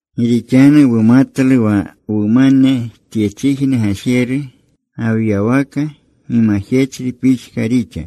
Gi rixanu wumatlu wa wumane tyechijne gajeru, gawyawaka, gimajechri pixka rixa.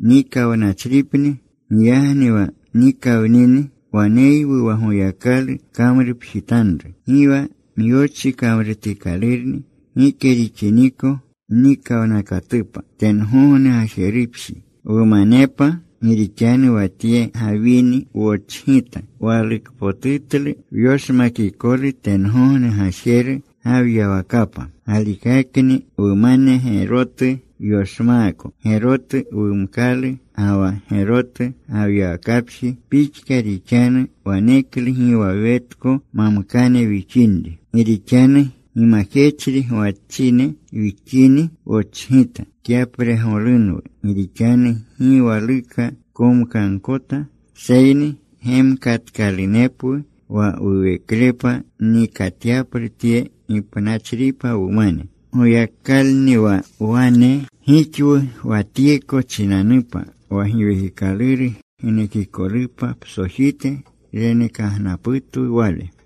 Nikawnachripni. Giyagni wa nikawnini, waneywu wa Goyakalu kamrupjitanru. Gi wa myochi kamrutikalurni, gike rixiniko mnikawnakatupa tengogne gajerupji, wumanepa. Gi rixanu wa tye gawini wochgita. Walukpotutlu wyoshmakikolu tengogne gajeru gawyawakapa. Galikakni wumane gerotu wyoshmaako Gerotu wumkalu ga wa gerotu gawyawakapji pixka rixanu. Waneklu gi wa wetko mamkane wixinri. Gi rixanu gimajechri gwachine wixini, wochgita. Kyapregolunwu. Gi rixanu gi waluka komkagkota, seyni gemkatkalunepwu wa wuweklepa nikatyaplu tye gipnachripa wumane. Goyakalni wa wane gixwu wa tyeko chinanupa. Wa Giwekikaluru genekikolupa psojite renekagnaputwu Wale.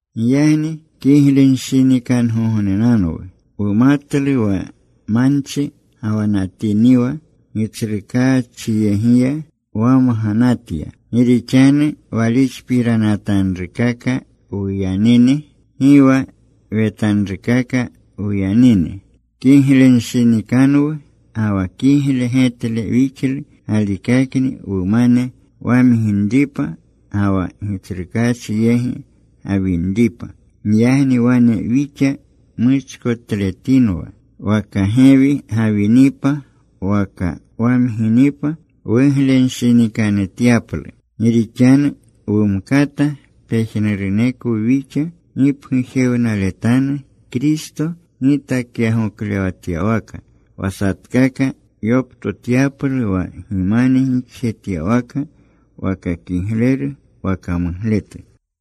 Giyagni kiglenshinikangognenanwu. Wumatlu wa manchi gawanatiniwa, Gitsrukaachyegiya wamganatya. Gi rixanu walixpiranatanrukaka wuyanini. Gi wa wetanrukaka wuyanini Kiglenshinikanwu. Ga wa kigle getle wixlu galikakni wumane wamginripa, ga wa Gitsrukaachi yegi gawinripa. Giyagni wane wixa muchkotletinwa, waka gewi gawinipa waka wamginipa, wuglenshinikanutyaplu. Gi rixanu wumkata pejnurunekwu wixa gipgujewnaletanu Kristo gitakyagoklewatyawaka, wa satkaka yoptotyaplu wa gimane gixjetyawaka, waka kigleru waka mugletu.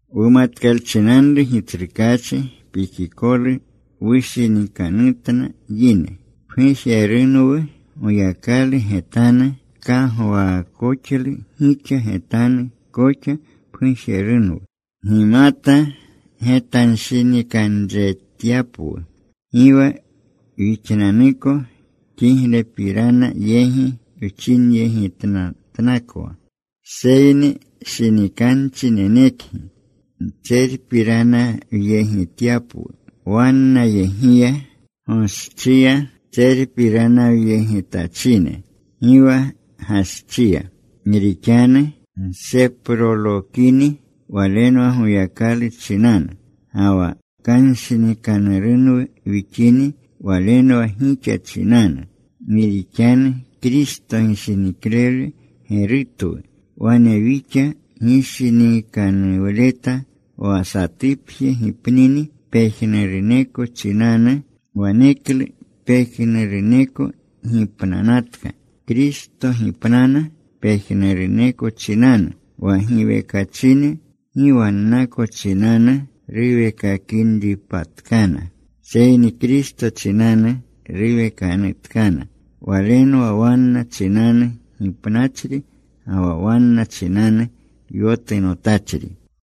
Wumatkalchinanru Gitsrukaachi pikikolu, wushinikanutna yine. Pgujerunwu Goyakalu getanu. Nkagwaakoxlu gixa getanu koxa pgujerunwu gimata getanshinikanretyapwu. Gi wa wixnanuko kiglepirana yegi wchinyegitnatnakwa. Seyni shinikanchi nenekgi ntserpiranyegityapwu wannayegiya, goschiya tserpiranyegitachine, gi wa gaschiya. Gi rixanu wseprolokini walenwa Goyakalu chinanu. Ga wa kanshinikanurunwu wixini walenwa gixa chinanu. Gi rixanu Kristo gishiniklewle gerutwu. Wane wixa gishinikanuwleta, wa satupje gipnini pejnuruneko chinanu, waneklu pejnuruneko gipnanatka. Kristo gipnana pejnuruneko chinanu, wa giwekachine gi wannako chinanu ruwekinripatkana, seyni Kristo chinanu ruwekanutkana. Walenwa wanna chinanu gipnachri ga wa wanna chinanu yotunotachri.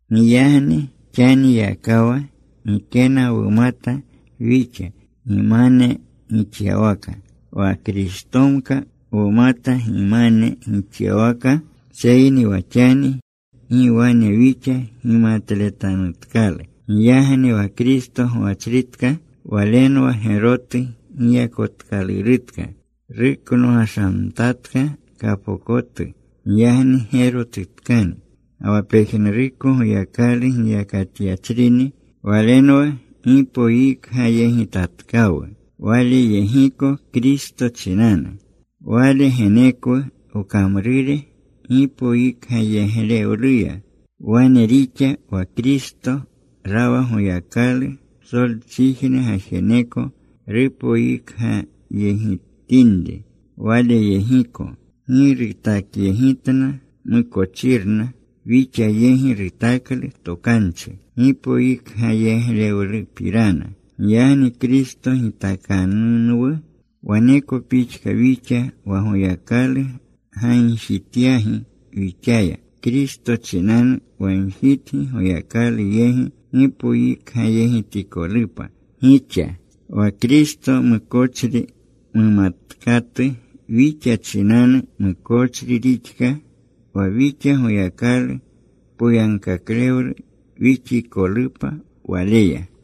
Giyagni xaniyakawa gikena wumata wixa gimane gixyawaka. Wa Kristomka wumata gimane gixyawaka, seyni wa xani gi wane wixa gimatletanutkalu. Giyagni wa Kristo gwachritka, walenwa gerotu giyakotkalurutka. Ruknogashamtatka kapokotu. Giyagni gerotutkani. Ga wa pejnuruko Goyakalu giyakatyachrini. Walenwa gipoyikgayegitatkawu Waleyegiko Kristo chinanu. Wale genekwu wkamrure gipoyikgayeglewluya. Wane rixa, wa Kristo rawa Goyakalu. Psolchijne gajeneko rupoyikgayegitinri Waleyegiko. Gi rutakyegitna mukochirna. Wixa yegi rutaklu tokanchi gipoyikgayeglewlupirana. Giyagni Kristo gitakanunwu. Waneko pixka wixa wa Goyakalu gagjityagi wixaya. Kristo chinanu wagjitgi, Goyakalu yegi gipoyikgayegitikolupa gixa. Wa Kristo mukochri mumatkatu wixa chinanu mukochri rixka, wa wixa Goyakalu poyagkaklewle wixikolupa Waleya.